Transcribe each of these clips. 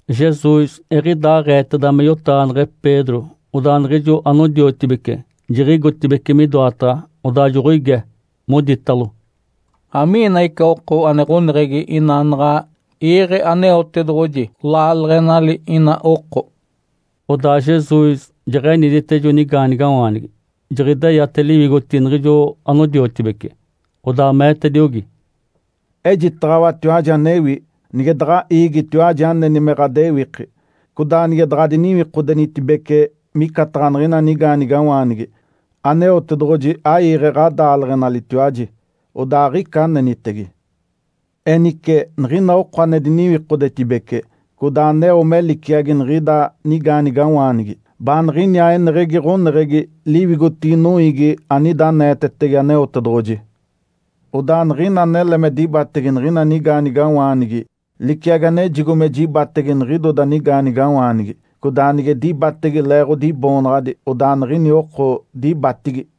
Jesus eɡ̶idaaɡ̶eeteda me yotaɡ̶aneɡ̶e Pedro, odaa niɡ̶ijo anodiotibece jiɡ̶igotibeci midoataɡ̶a, odaa joɡ̶oige, moditalo, “Amiina ica oko ane ɡ̶oneɡ̶egi ina naɡ̶a iiɡ̶e Aneotedoɡ̶oji laaleɡ̶enali ina oko?” Odaa Jesus jeɡ̶enidite ijo nigaanigawaanigi, jiɡ̶ideyate liwigotigi niɡ̶ijo anodiotibece. Odaa meetediogi, “Ejitaɡ̶awatiwaji anewi. Nige daɡ̶a iigitiwaji aneni me ɡ̶adewiki, codaa nige daɡ̶adiniwikodenitibece micataɡ̶a niɡ̶ini nigaanigawaanigi, Aneotedoɡ̶oji aiiɡ̶e ɡ̶adaaleɡ̶enalitiwaji, odaa aɡ̶ica anenitege. Enice, niɡ̶ina oko ane diniwikodetibece, codaa aneo me liciagi niɡ̶ida nigaanigawaanigi, baaniɡ̶iniaa eneɡ̶egi ɡ̶oneɡ̶egi liwigotigi noiigi anida aneetetege Aneotedoɡ̶oji. Odaa niɡ̶ina anele me dibatege niɡ̶ina nigaanigawaanigi liciagi anejigo me jibatege niɡ̶idoda nigaanigawaanigi, codaa nige dibatege leeɡ̶odi Iboonaɡ̶adi, odaa niɡ̶ini oko dibatigi.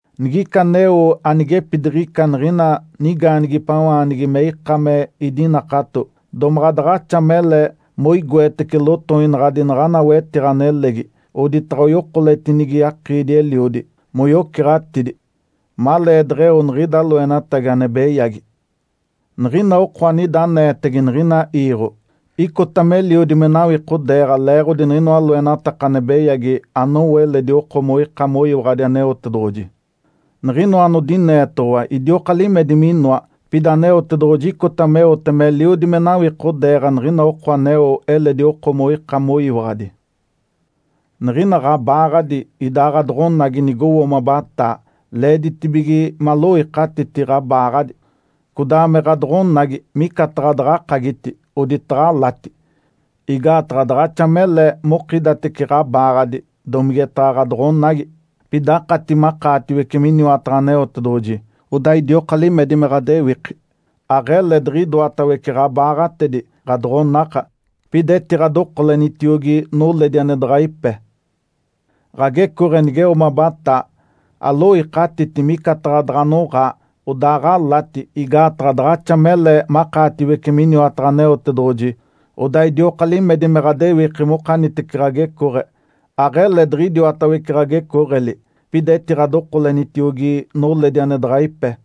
Nigica aneo anigepidiɡ̶ica niɡ̶ina nigaanigipawaanigi me ika me idinakato, domaɡ̶a daɡ̶axa mele moigoetece lotoinaɡ̶adi naɡ̶ana wetiɡ̶a nelegi, oditaɡ̶a oyokoletinigi akiidi-eliodi moyoceɡ̶atidi, maleedeɡ̶eo niɡ̶ida loenatagi ane beyagi. Niɡ̶ina oko anida aneetege niɡ̶ina iiɡ̶o icota meliodi me nawikodeeɡ̶a leeɡ̶odi niɡ̶inoa loenataka ane beyagi anowo eledi oko moika moyiwaɡ̶adi Aneotedoɡ̶oji. Niɡ̶inoa anodineetoɡ̶owa idioka limedi minoa, pida Aneotedoɡ̶oji icota meote meliodi me nawikodeeɡ̶a niɡ̶ina oko aneo eledi oko moika moyiwaɡ̶adi. Niɡ̶ina ɡ̶abaaɡ̶adi, idaa ɡ̶adoɡ̶onagi nigowo mabataa, leeditibige maloikatiti ɡ̶abaaɡ̶adi, codaa me ɡ̶adoɡ̶onagi micataɡ̶a daɡ̶akagiti, oditaɡ̶a alati. Igaataɡ̶a daɡ̶axa mele mokidatece ɡ̶abaaɡ̶adi, domigetaɡ̶a ɡ̶adoɡ̶onagi, pida akati makaatiwece miniwataɡ̶a Aneotedoɡ̶oji, odaa idioka limedi me ɡ̶adewiki. Aɡ̶ele diɡ̶idoatawece ɡ̶abaaɡ̶atedi, ɡ̶adoɡ̶onaka, pida etiɡ̶adokolenitiogi noledi ane daɡ̶a ipe. Ǥagecooɡ̶e nigeo mabataa, aloikatiti, micataɡ̶a daɡ̶a anoɡ̶aa, odaaɡ̶alati. Igaataɡ̶a daɡ̶axa mele makaatiwece miniwataɡ̶a Aneotedoɡ̶oji, odaa idioka limedi me ɡ̶adewiki mokanitece ɡ̶agecooɡ̶e. Aɡ̶ele diɡ̶idiwatawece ɡ̶agecooɡ̶eli, pida etiɡ̶adokolenitiogi noledi ane daɡ̶a ipe.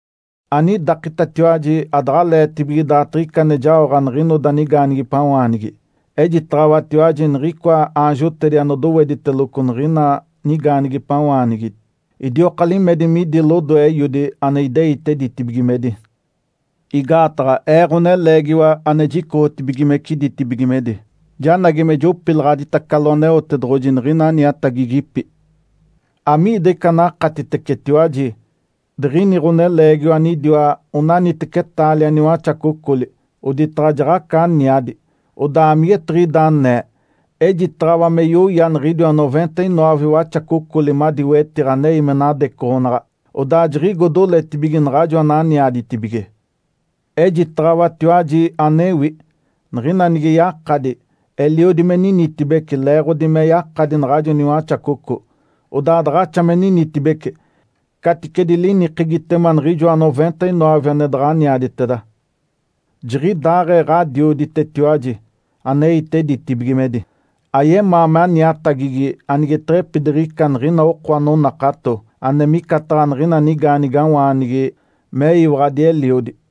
Anidakitatiwaji adaɡ̶aleetibige daatiɡ̶ica ane jaoɡ̶a niɡ̶inoda nigaanigipawaanigi. Ejitaɡ̶awatiwaji niɡ̶icoa aanjotedi anodowediteloco niɡ̶ina nigaanigipawaanigi idioka limedi midi lodoe Eiodi ane ideite ditibigimedi. Igaataɡ̶a Ee, Ǥoneleegiwa ane jicoɡ̶otibigimece ditibigimedi, janagi me jopilaɡ̶aditacalo Aneotedoɡ̶oji niɡ̶ina aniatagigipi. Amiida ica anakatitecetiwaji? Diɡ̶ini ɡ̶oneleegiwa anidiwa onaniteci taalia niwaxacocoli, oditaɡ̶a jaɡ̶aca aniadi. Odaa amigetiɡ̶ida anee? Ejitaɡ̶awa me yoya niɡ̶idiwa noventa-noove waxacocoli madi wetiɡ̶a anei me nadecoɡ̶onaɡ̶a. Odaa jiɡ̶igo doletibige naɡ̶ajo ananiaditibige. Ejitaɡ̶awatiwaji anewi. Niɡ̶ina nige yakadi, eliodi me ninitibece, leeɡ̶odi me yakadi naɡ̶ajo niwaxacoco, odaa daɡ̶axa me ninitibece, caticedi linikegitema niɡ̶ijoa noventa-noove ane daɡ̶aniaditeda. Jiɡ̶idaaɡ̶ee Ǥadioditetiwaji aneite ditibigimedi, ayemaa me aniatagigi anigeteɡ̶epidiɡ̶ica niɡ̶ina oko anonakato ane micataɡ̶a niɡ̶ina nigaanigawaanigi meyiwaɡ̶adi eliodi.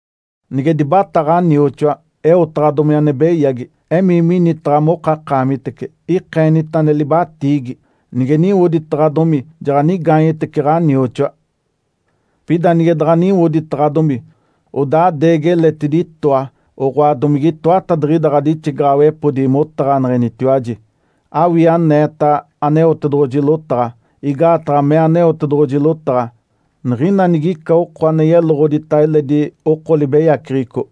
Nige dibatá ɡ̶anioxoa, eotaɡ̶adomi ane beyagi, emii minitaɡ̶a mokakaamitece, ikeenita ane libatiigi. Nige niwoditaɡ̶adomi, jaɡ̶anigaanyetece ɡ̶anioxoa. Pida nige daɡ̶a niwoditaɡ̶adomi, odaa adeegi eletidi itoa oɡ̶oa domige itoatadiɡ̶ida ɡ̶adixigaɡ̶awepodi motaɡ̶aneɡ̶enitiwaji, awii aneeta Aneotedoɡ̶oji lotaɡ̶a. Igaataɡ̶a mee Aneotedoɡ̶oji lotaɡ̶a, ‘Niɡ̶ina nigica oko ane yeloɡ̶odita eledi oko libeyaceɡ̶eco,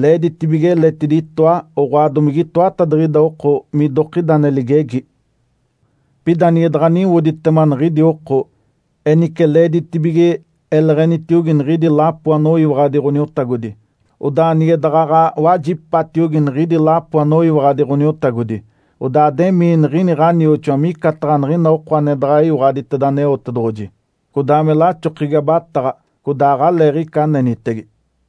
leeditibige eletidi itoa oɡ̶oa domige itoatadiɡ̶ida oko midokida ane ligegi.’ Pida nige daɡ̶a niwoditema niɡ̶idi oko, enice leeditibige eleɡ̶enitiogi niɡ̶idi lapo anoyiwaɡ̶adi Ǥoniotagodi. Odaa nige daɡ̶aɡ̶a wajipatiogi niɡ̶idi lapo anoyiwaɡ̶adi Ǥoniotagodi, odaa ademii niɡ̶ini ɡ̶anioxoa micataɡ̶a niɡ̶ina oko ane deɡ̶eyiwaɡ̶aditeda Aneotedoɡ̶oji, codaa me laxokegi abataɡ̶a, codaa aɡ̶aleeɡ̶ica anenitege.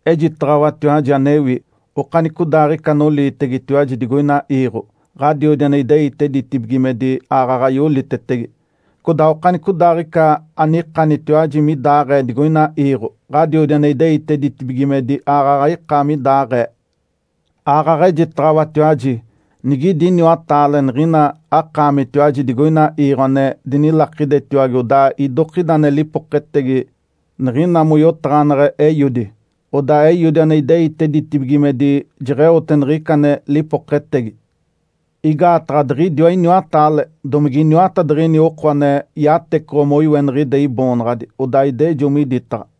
Ejitaɡ̶awatiwaji anewi. Okanicodaaɡ̶ica anoliitegetiwaji digoina iiɡ̶o, Ǥadiodi ane ideite ditibigimedi aaɡ̶aɡ̶a yolitetege. Codaa okanicodaaɡ̶ica anikanitiwaji midaɡ̶aee digoina iiɡ̶o, Ǥadiodi ane ideite ditibigimedi aaɡ̶aɡ̶a ika midaɡ̶aee. Aaɡ̶aɡ̶a ejitaɡ̶awatiwaji, nigidi iniwataale niɡ̶ina akaamitiwaji digoina iiɡ̶o ane dinilakidetiwage odaa idokida ane lipoketegi niɡ̶ina moyotaɡ̶aneɡ̶e Eiodi, odaa Eiodi ane ideite ditibigimedi jeɡ̶eote niɡ̶ica ane lipoketegi. Igaataɡ̶a diɡ̶idiwa iniwataale, domige iniwatadiɡ̶ini oko ane yatecoɡ̶o moiweniɡ̶ide Iboonaɡ̶adi, odaa idejo miditaɡ̶a.”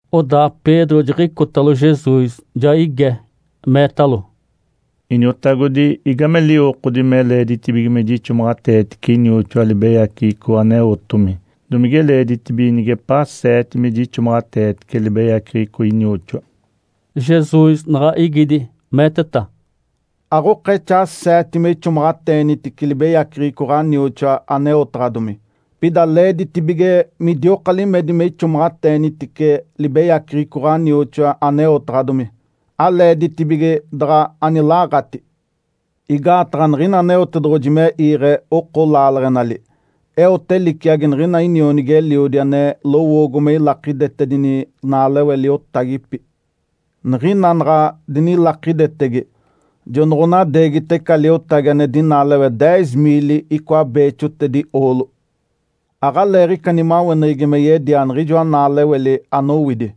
Odaa Pedro jiɡ̶icotalo Jesus, ja ige, meetalo, “Iniotagodi, igame liwokodi me leeditibige me jixomaɡ̶ateetice inioxoa libeyaceɡ̶eco aneotomi? Domige leeditibige nigepaa seete me jixomaɡ̶ateetice libeyaceɡ̶eco inioxoa?” Jesus naɡ̶a igidi, meeteta, “Aɡ̶okexaa seete me ixomaɡ̶ateenitice libeyaceɡ̶eco ɡ̶anioxoa aneotaɡ̶adomi. Pida leeditibige midioka limedi me ixomaɡ̶ateenitice libeyaceɡ̶eco ɡ̶anioxoa aneotaɡ̶adomi, aleeditibige daɡ̶a anilaɡ̶ati. Igaataɡ̶a niɡ̶ina Aneotedoɡ̶oji me iiɡ̶e oko laaleɡ̶enali, eote liciagi niɡ̶ina inionigi-eliodi ane lowoogo me ilakidetedini naalewe liotagipi. Niɡ̶ina naɡ̶a dinilakidetege, jonoɡ̶onadeegita ica liotagi ane dinaalewe deez miili icoa beexotedi oolo. Aɡ̶aleeɡ̶ica nimaweneɡ̶egi me yedia niɡ̶ijoa naaleweli anowidi.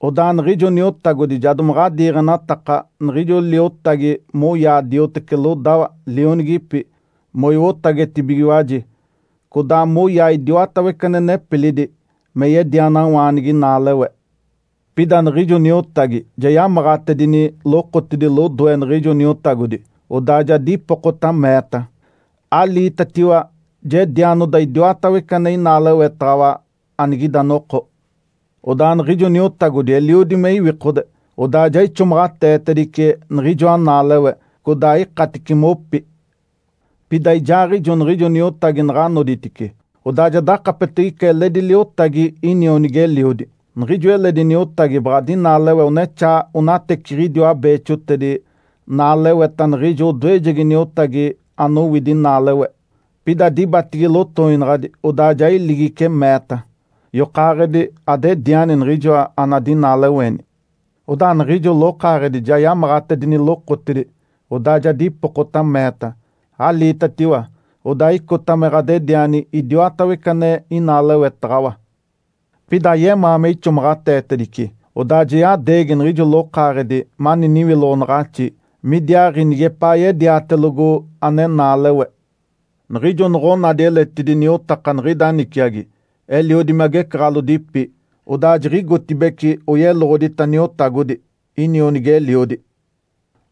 Odaa niɡ̶ijo niotagodi ja domaɡ̶a diiɡ̶enataka niɡ̶ijo liotagi moyaa dioteci lodawa, lionigipi, moiwotagetibigiwaji, codaa moyaa idiwatawece ane nepilidi me yedianawaanigi naalewe. Pida niɡ̶ijo niotagi ja yamaɡ̶atedini lokotidi lodoe niɡ̶ijo niotagodi, odaa ja dipokota, meeta, ‘Aliitatiwa, jedianoda idiwatawece ane inaalewetaɡ̶awa anigida noko.’ Odaa niɡ̶ijo niotagodi eliodi me iwikode, odaa ja ixomaɡ̶ateetedice niɡ̶ijoa naalewe, codaa ikatice mopi. Pida ijaaɡ̶ijo niɡ̶ijo niotagi naɡ̶a noditice, odaa ja dakapetege ica eledi liotagi inionigi-eliodi. Niɡ̶ijo eledi niotagi baɡ̶a dinaalewe onexaa onateciɡ̶idiwa beexotedi naaleweta niɡ̶ijo odoejegi niotagi anowidi naalewe. Pida dibatigi lotoinaɡ̶adi, odaa ja iligice, meeta, ‘Yokaaɡ̶edi adediani niɡ̶ijoa anadinaalewe!’ Odaa niɡ̶ijo lokaaɡ̶edi ja yamaɡ̶atedini lokotidi, odaa ja dipokota, meeta, ‘Aliitatiwa, odaa icota me ɡ̶adediani idiodatawece ane inaalewetaɡ̶awa.’ Pida ayemaa me ixomaɡ̶ateetedice, odaa ja yadeegi niɡ̶ijo lokaaɡ̶edi mani niwiloɡ̶onaɡ̶axi midiaaɡ̶i nigepaa yediatelogo ane naalewe. Niɡ̶ijo noɡ̶onadi eletidi niotaka niɡ̶ida niciagi, eliodi me agecaɡ̶alodipi, odaa jiɡ̶igotibeci oyeloɡ̶odita niotagodi, inionigi-eliodi.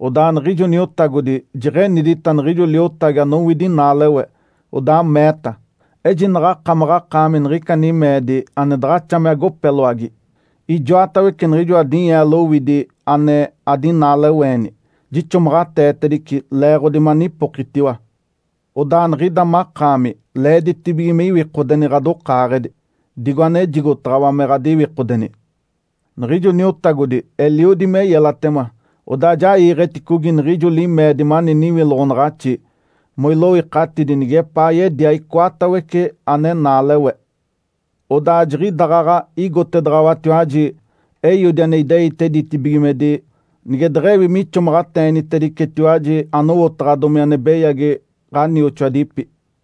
Odaa niɡ̶ijo niotagodi jeɡ̶enidita niɡ̶ijo liotagi anowidi naalewe, odaa meeta, ‘Ejinaɡ̶a akamaɡ̶akaami niɡ̶ica nimeedi ane daɡ̶axa me agopeloagi! Ijoatawece niɡ̶ijoa dinyeelo owidi ane adinaaleweeni jixomaɡ̶ateetedice leeɡ̶odi manipokitiwa. Odaa niɡ̶ida makaami leeditibige me iwikodeni ɡ̶adokaaɡ̶edi, digo anejigotaɡ̶awa me ɡ̶adiwikodeni.’ Niɡ̶ijo niotagodi eliodi me yelatema, odaa ja iiɡ̶eticogi niɡ̶ijo limeedi mani niwiloɡ̶onaɡ̶axi moiloikatidi nigepaa yedia icoatawece ane naalewe. Odaa jiɡ̶idaɡ̶aɡ̶a igotedaɡ̶awatiwaji Eiodi ane ideite ditibigimedi nige deɡ̶ewi mixomaɡ̶ateenitedicetiwaji anowotaɡ̶adomi ane beyagi ɡ̶anioxoadipi.”